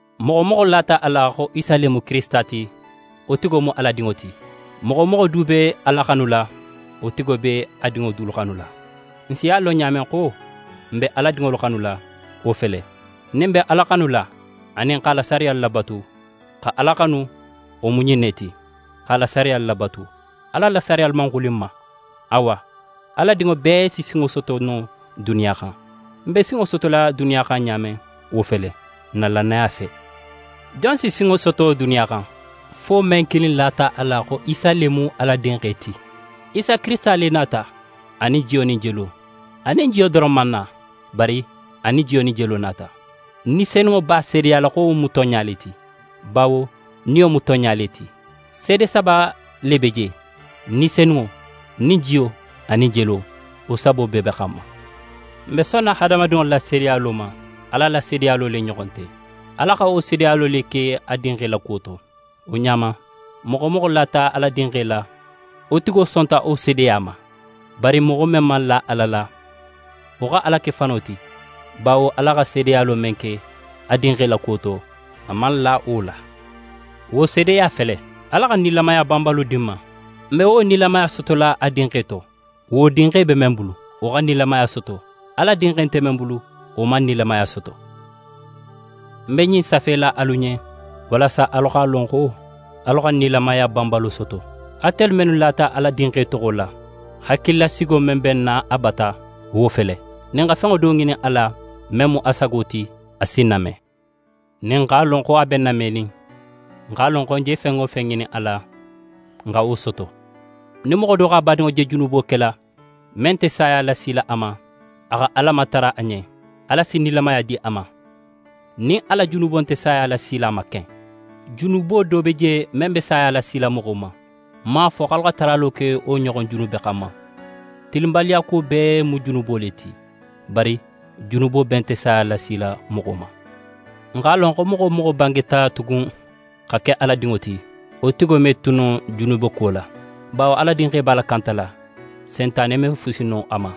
Moxo wo moxo lata a la xo Isa le mu Kirisita ti, wo tigo mu Ala dinŋo ti. Moxo wo moxo du be Ala xanula, wo tigo be a dinŋo dulu xanula. N si a lon ɲa men xo n be Ala dinŋolu xanula, wo fele: Nin n be Ala xanula anin x'a la sariyalu labatu. Xa Ala xanu, wo mu ɲin ne ti, x'a la sariyalu labatu. A la sariyalu man xuli n ma. Awa, Ala dinŋo bee si sinŋo soto no duniya xan. N be sinŋo sotola duniya xan ɲa men, wo fele: N na lannaya fe. Jon si sinŋo soto duniya xan? Fo men kilin lata a la xo Isa le mu Ala Dinxe ti. Isa Kirisita le nata, a nin jiyo nin jelo. A nin jiyo doron man na, bari a nin jiyo nin jelo nata. Ni Senunŋo b'a seedeyala xo wo mu tonɲa le ti, bawo Niyo mu tonɲa le ti. Seede saba le be je. Ni Senunŋo nin jiyo anin jelo, wo sabo bee be xanma. N be sonna hadamadinŋolu la seedeyalo ma, Ala la seedeyalo le ɲoxon nte. Ala xa wo seedeyalo le ke a Dinxe la kuwo to. Wo ɲa ma, moxo wo moxo lata Ala Dinxe la, wo tigo sonta wo seedeya ma; bari moxo men man la Ala la, wo xa Ala ke fano ti, bawo Ala xa seedeyalo men ke a Dinxe la kuwo to, a man la wo la. Wo seedeya fele: Ala xa nilamaya banbalo di n ma. N be wo nilamaya sotola a Dinxe to. Wo Dinxe be men bulu, wo xa nilamaya soto. Ala Dinxe nte men bulu, wo man nilamaya soto. Ń be ɲin safela alu ɲen, walasa alu x'a lon xo alu xa nilamaya banbalo soto, atelu mennu lata Ala Dinxe toxo la. Hakililasigo men be n na a bata, wo fele: Nin n xa fen do ŋinin a la men mu a sago ti, a si n name. Nin n x'a lon xo a be n namenin, n x'a lon xo n je fen wo fen ŋinin a la, n xa wo soto. Nin moxo do x'a badinŋo je junubo kela men nte saya lasila a ma, a xa Ala matara a ɲen, Ala si nilamaya di a ma, nin a la junubo nte saya lasila a ma ken. Junubo do be je men be saya lasila moxo ma. Ń man a fo xo alu xa taralo ke wo ɲoxon junube xanma. Tilinbaliyakuwo bee mu junubo le ti. Bari junubo bee nte saya lasila moxo ma. N x'a lon xo moxo wo moxo bangeta tugun xa ke Ala dinŋo ti, wo tigo me tu no junubeko la, bawo Ala Dinxe b'a lakantala, Sentane me fusi no a ma.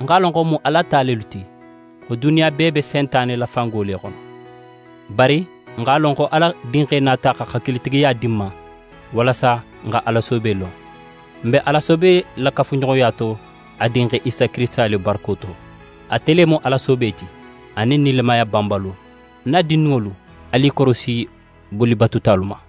N x'a lon xo n mu Ala ta lelu ti, xo duniya bee be Sentane la fango le xono. Bari n x'a lon xo Ala Dinxe nata, xa hakilitigiya di n ma, walasa n xa Ala soobe lon. N be Ala soobe la kafuɲoxoya to a Dinxe Isa Kirisita le barako to. Ate le mu Ala soobe ti, anin nilamaya banbalo. Ń na dindinŋolu, alu i korosi bolibatutalu ma.